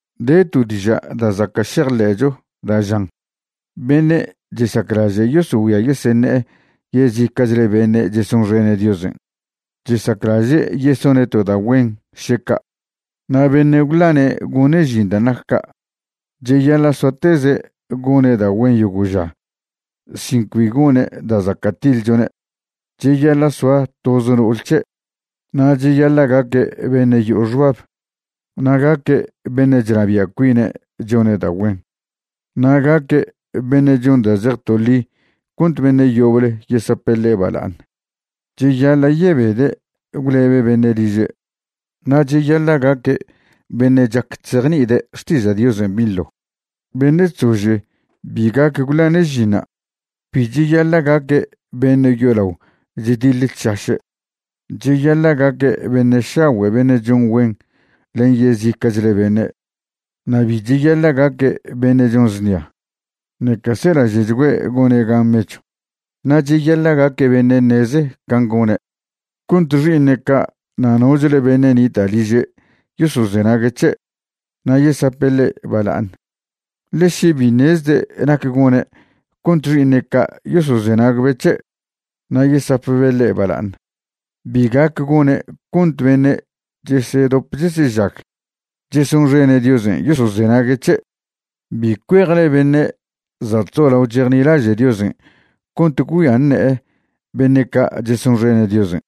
De to diža' da' zaca' šejḻe'cho da' žan: “Beṉe' chesaclaže' yosogüia yeseṉe'e yezica'chle beṉe' chesonxene' Diosen', chesaclaže' yesone' to da' güen, še ca'.” Na' beṉe' gwḻane' gone' žin dan' nac ca' cheyaḻa' soateze' gone' da' güen yogo' ža sin cbi gone' da' zaca' tiḻchone'. Cheyaḻa' soa toz no'ol c̱he', na' cheyaḻa' gaque' beṉe' yo'o xbab, na' gaque' beṉe' chnabia' cuine' chone' da' güen, na' gaque' beṉe' chon da' zej toḻi cont beṉe' yoble yesape' ḻe' bala'aṉ. Cheyaḻa' yebede' gwlebe' beṉe' liže', na' cheyaḻa' gaque' beṉe' chac chzejni'ide' xtiža' Diosen' binḻo. Beṉe' chzože bi gac gwḻane' žinṉa'. Bi cheyaḻa' gaque' beṉe' yolao chdiḻe chšaše'. Cheyaḻa' gaque' beṉe' šagüe' beṉe' chon güen len yezica'chle beṉe', na' bi cheyaḻa' gaque' beṉe' chon znia, ṉeca selaže'chgüe' gone' gan mechw. Na' cheyaḻa' gaque' beṉe' ṉeze can' gone' cont xi'iṉe' ca' na' nochle beṉe' nita' liže' yosozenague' c̱he' na' yesape' ḻe' bala'aṉ. Ḻe še bi ṉezde' nac gone' cont xi'iṉe' ca' yosozenagbe' c̱he' na' yesapbe' ḻe' bala'aṉ, bi gac gone' cont beṉe' chesedop chesežag chesonxene' Diosen' yosozenague' c̱he'. Bi cuejle beṉe' za' chzolao chejnilaže' Diosen' cont gwgüia ṉe'e beṉe' ca' chesonxene' Diosen',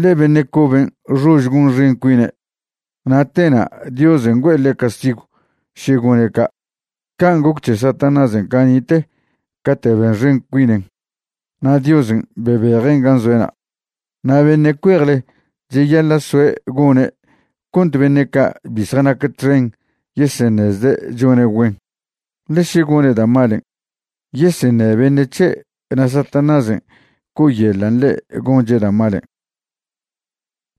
ḻe beṉe' coben' xož gonxen cuine' na' tena' Diosen' güe'e ḻe' castigw še gone' ca'. Can' goc c̱he Satanásen' cani'te cate' benxen cuinen na' Diosen' bebejen' gan' zoe'na'. Na' beṉe' cuejle cheyaḻa' soe' gone' cont beṉe' ca' bi zjanac txen yeseṉezde' chone' güen, ḻe še gone' da' malen' yeseṉe' beṉe' c̱he' na' Satanásen' co'oyeḻan' ḻe' gonche' da' malen'.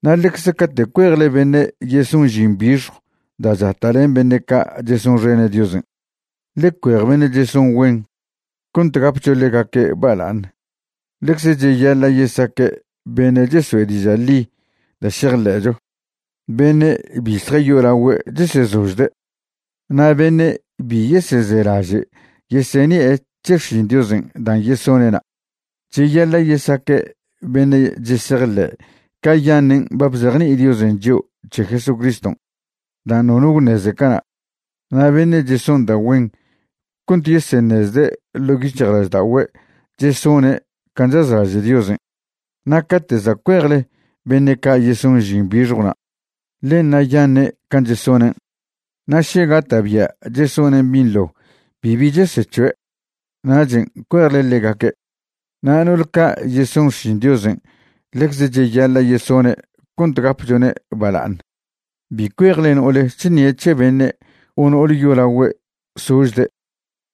Na' ḻecze cate' cuejle beṉe' yeson žin bixjw da' chata' len beṉe' ca' chesonxene' Diosen', ḻe cuej beṉe' cheson güen cont gapcho ḻegaque' bala'aṉ. Ḻecze cheyaḻa' yesaque' beṉe' chesoe' diža' ḻi da' šejḻe'cho, beṉe' bi zjayolagüe' chesezožde', na' beṉe' bi yesezelaže' yeseṉi'e c̱he xšin Diosen' dan' yesone'na'. Cheyaḻa' yesaque' beṉe' chesejḻe'e cayaṉen' ba bzejni'i Diosen' chio' c̱he Jesucriston' dan' nono gwṉeze cana', na' beṉe' cheson da' güen cont yeseṉezde' ḻo' yic̱hjlažda'ogüe' chesone' can' chazlaže' Diosen'. Na' cate' za' cuejle beṉe' ca' yeson žin bixjwna', ḻe ṉa'yaṉe' can' chesonen', na' še gata'bia' chesonen' binḻo bibi chesec̱hoe', nachen' cuejle ḻegaque'. Na' no'ol ca' yeson xšin Diosen' ḻecze cheyaḻa' yesone' cont gapchone' bala'aṉ. Bi cuejle no'ole chṉie' c̱he beṉe' o no'ole yolagüe' sožde',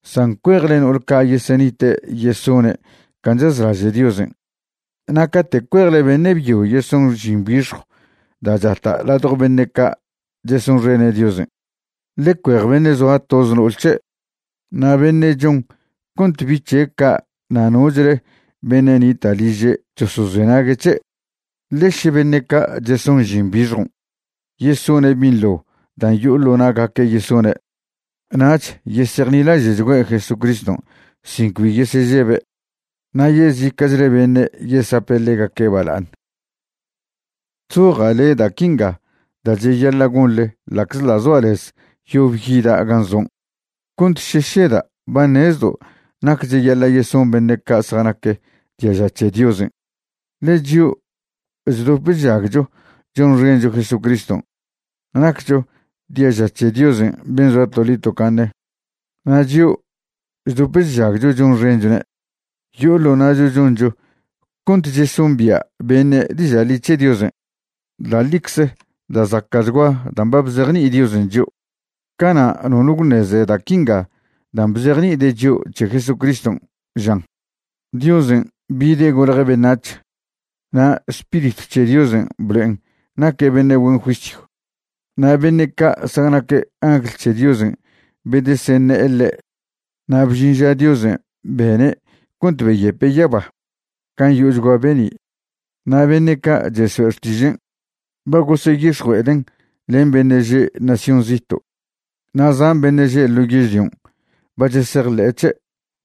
san cuejle no'ol ca' yesenite' yesone' can' chazlaže' Diosen'. Na' cate' cuejle beṉe' byo yeson žin bixjw da' chata' ladjo beṉe' ca' chesonxene' Diosen', ḻe cuej beṉe' zoa toze no'ol c̱he', na' beṉe' chon cont bi' c̱he' ca' na' nochle beṉe' nita' liže' chosozenague' c̱he'. Ḻe še beṉe' ca' cheson žin bixjon' yesone' binḻo dan' yo'o ḻo na'gaque' yesone', nach yesejnilaže'chgüe' Jesucriston' sin cbi yesežebe', na' yezica'chle beṉe' yesape' ḻegaque' baḻa'aṉ. Chzoja' le' da' quinga da' cheyaḻa' gonḻe ḻa'czḻa' zoa' lez yob yida' gan' zon', cont še šeda' ba ṉezdo' nac cheyaḻa' yeson beṉe' ca' zjanac diaža c̱he Diosen', ḻe chio' chdop chžagcho chonxencho Jesucriston' naccho diaža c̱he Diosen' ben' zoa toḻi tocaṉe. Na' chio' chdop chžagcho chonxenchone' yo'o ḻo na'cho choncho cont chesombia' beṉe' diža' ḻi c̱he Diosen'. Da' ḻicze da' zaca'chgua dan' ba bzejni'i Diosen' chio'. Cana' nono gwṉeze da' quinga dan' bzejni'ide' chio' c̱he Jesucriston', žan: Diosen' bide' golje' beṉac̱h, na' Spiritw c̱he Diosen' blo'en naque' beṉe' güen juisyw. Na' beṉe' ca' zjanac angl c̱he Diosen' bedeseṉe'e ḻe'. Na' bžin ža Diosen' bene' cont beyepe' yaba gan' yo'ochgua be'ni'. Na' beṉe' ca' cheso'e xtižen' ba goseyix̱jue'eden' len beṉe' že' nación zito', na' zan beṉe' že' ḻo yežlion' ba chesejḻe'e c̱he'.